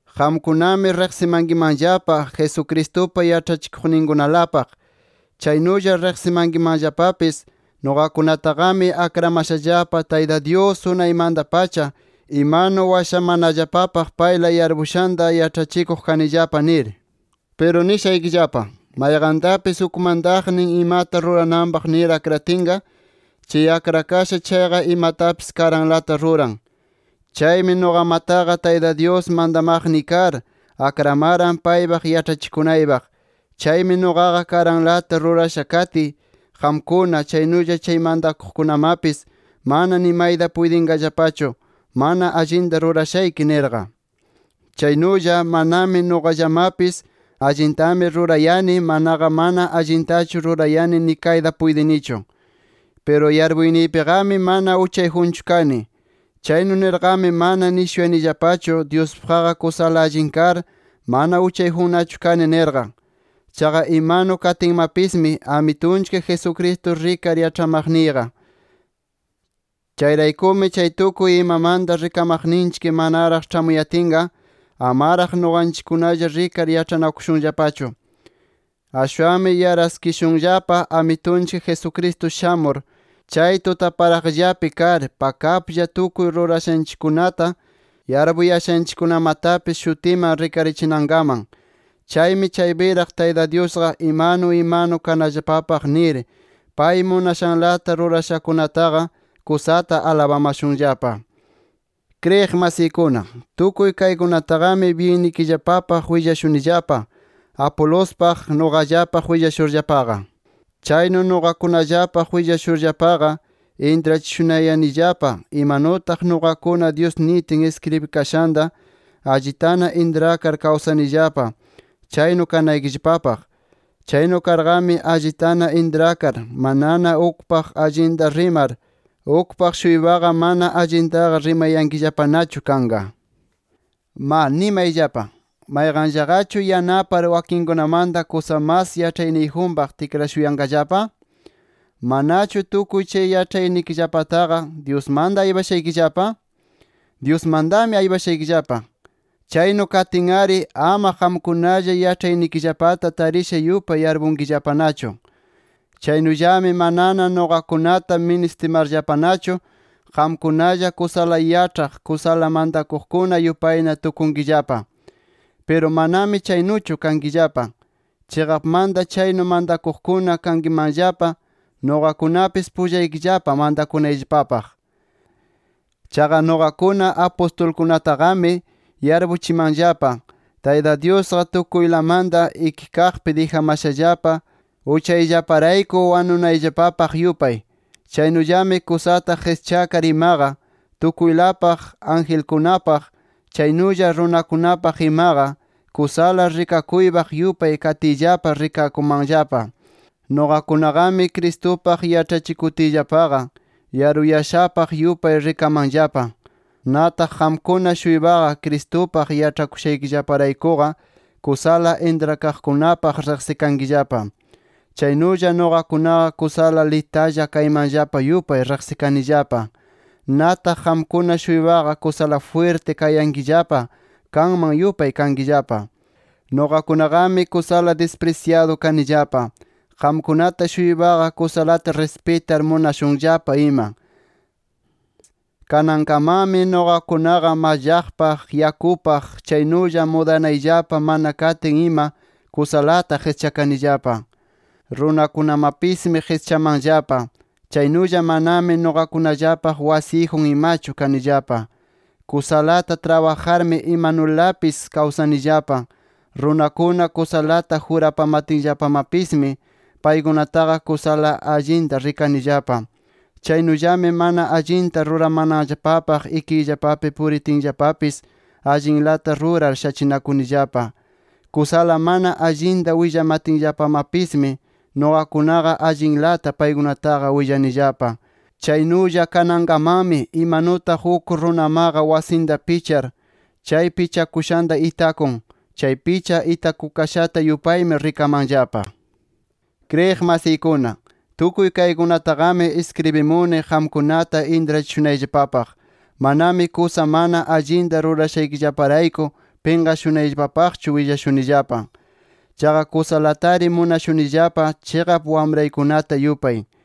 Qamkunami riqsimankimanllapa Jesucristupa yaĉhachikuqninkunalapaq. Chaynulla riqsimankimanllapapis nuqakunataqami akramashallapa, Tayta Dyus unaymanta-pacha imanu washamanallapapaq payla yarpushanta yaĉhachikuq kanillapa, nir. Piru nishaykillapa: Mayqantapis uk mantaqnin imata rurananpaq nir akratinqa, chay akrakasha chayqa imatapis karanlata ruran. Chaymi nuqamataqa, Tayta Dyus mantamaqniy kar, akramaran paypaq yaĉhachikunaypaq. Chaymi nuqaqa karanlata rurasha katiy, qamkuna, chaynulla chay mantakuqkunamapis mana nimayta puytinqallapachu mana allinta rurashayki nirqa. Chaynulla manami nuqallamapis allintami rurayani, manaqa mana allintachu rurayani nikayta puytinichu Piru yarpuyniypiqami mana uchayjunchu kani. Chaynu nirqami, mana nishunayanillapachu Dyuspaqqa kusala allin kar mana uchayjunnachu kani nirqa. Chaqa imanu katiymapismi, Amitunchik Jesucristo rikar yaĉhamaqniyqa. Chayraykumi, chay tukuy imamanta rikamaqninchik manaraq ĉhamuyatinqa, amaraq nuqanchikkunalla rikar yaĉhanakushunllapachu. Ashwanmi yaraskishunllapa Amitunchik Jesucristo shamur, chay tutaparaqllapi kar pakaplla tukuy rurashanchikkunata, yarpuyashanchikkunamatapis shutiman rikarichinankaman. Chaymi chaypiraq Tayta Dyusqa imanu imanu kanallapapaq nir, pay munashanlata rurashakunataqa kusata alabamashunllapa. Kriyiq masiykuna, tukuy kaykunataqami byinnikillapapaq willashunillapa Apolospaq, nuqallapaq willashurllapaqa. Chaynu nuqakunallapaq willashurllapaqa intrachishunayanillapa imanutaq nuqakuna Dyus nitin iskribikashanta allitana intrakar kawsanillapa chaynu kanaykillapapaq. Chaynu karqami, allitana intrakar, manana ukpaq allinta rimar, ukpaq-shuypaqa mana allintaqa rimayankillapanachu kanqa. ¡Ma nimayllapa! ¿Mayqanllaqachu yanapar wakinkunamanta kusa mas yaĉhayniyjunpaq tikrashuyanqallapa? ¿Manachu tukuy yaĉhaynikillapataqa Dyusmanta aypashaykillapa? ¡Dyusmantami aypashaykillapa! Chaynu katin-ari ama qamkunalla yaĉhaynikillapata tarisha yupay yarpunkillapanachu. Chaynullami manana nuqakunata ministimarllapanachu, qamkunalla kusala yaĉhaq, kusala mantakuqkuna yupayna tukunkillapa. Piru manami chaynuchu kankillapa. Chiqapmata chaynu mantakuqkuna kankimanllapa, nuqakunapis pullaykillapa mantakunayllapapaq. Chaqa nuqakuna apustulkunataqami yarpuchimanllapa, Tayta Dyusqa tukuylamanta ikikaqpi dijamashallapa, uchayllaparayku wanunayllapapaq yupay. Chaynullami kusata qischakar imaqa tukuylapaq, angelkunapaq, chaynulla runakunapaq imaqa, kusala rikakuypaq yupay katiyllapa rikakumanllapa. Nuqakunaqami, Cristupaq yaĉhachikutiyllapaqa, yaruyashapaq yupay rikamanllapa. Nataq qamkuna-shuypaqa, Cristupaq yaĉhakushaykillaparaykuqa, kusala intrakaqkunapaq riqsikankillapa. Chaynulla nuqakunaqa kusala litalla kaymanllapa yupay riqsikanillapa. Nataq qamkuna-shuypaqa kusala jwirti kayankillapa kanman yupay kankillapa. Nuqakunaqami kusala disprisyadu kanillapa, qamkunata-shuypaqa kusalata rispitar munashunllapa ima. Kanankamanmi nuqakunaqa mallaqpaq, yakupaq, chaynulla mudanayllapa mana katin ima kusalata qischakanillapa. Runakunamapismi qischamanllapa, chaynulla manami nuqakunallapaq wasiyjun imachu kanillapa. Kusalata trabajarmi imanulapis kawsanillapa. Runakuna kusalata jurapamatinllapamapismi, paykunataqa kusala allinta rikanillapa. Chaynullami mana allinta ruramananllapapaq ikiyllapapi puritinllapapis allinlata rurar shachinakunillapa. Kusala mana allinta willamatinllapamapismi nuqakunaqa allinlata paykunataqa willanillapa. Chaynulla kanankamanmi imanutaq uk runamaqa wasinta pichar, chay pichakushanta itakun, chay picha itakukashata yupaymi rikamanllapa. Kriyiq masiykuna, tukuy kaykunataqami iskribimuni qamkunata intrachishunayllapapaq. Manami kusa mana allinta rurayashaykillaparayku pinqashunaypaqchu willashunillapa. Chaqa kusalatari munashunillapa chiqap wamraykunata yupay.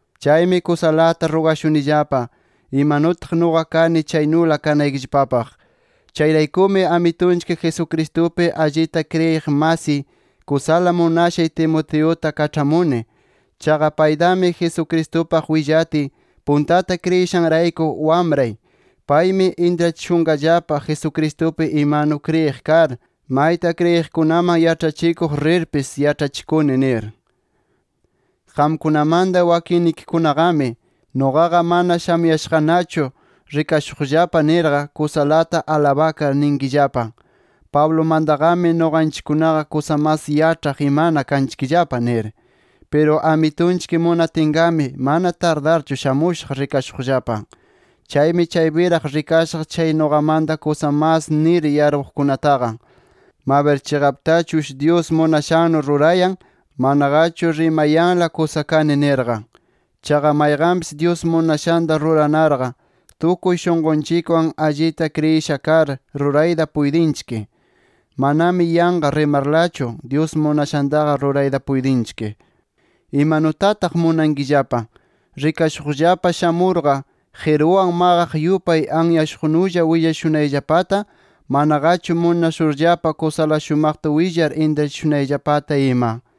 Chaymi kusalata rugashunillapa, imanutaq nuqa kani chaynula kanaykillapapaq. Chayraykumi Amitunchik Jesucristupi allita kriyiq masiy, kusala munashay Timoteuta kaĉhamuni. Chaqa paytami Jesucristupaq willatiy puntata kriyishanrayku, wamray. Paymi intrachishunqallapa Jesucristupi imanu kriyiq kar, mayta kriyiqkunaman yaĉhachikuq rirpis, yaĉhachikuni nir. Qamkunamanta wakinnikikunaqami, nuqaqa mana shamuyashaqnachu rikashuqllapa nirqa, kusalata alabakar ninkillapa: “Pablumantaqami nuqanchikkunaqa kusa mas yaĉhaq imana kanchikllapa” nir. Piru Amitunchik munatinqami, mana tardarchu shamushaq rikashuqllapa. Chaymi chaypiraq rikashaq chay nuqamanta kusa mas nir yarpuqkunataqa, mabir chiqaptachush Dyus munashannu rurayan, manaqachu rimayanla kusa kani nirqa. Chaqa mayqanpis Dyus munashanta ruranarqa, tukuy shunqunchikwan allita kriyisha kar, rurayta puytinchik. Manami yanqa rimarlachu Dyus munashantaqa rurayta puytinchik. ¿Imanutataq munankillapa: Rikashuqllapa shamurqa qiruwan maqaq yupay anyashuqnulla willashunayllapata, manaqachu munashurllapa kusala shumaqta willar intrachishunayllapata ima?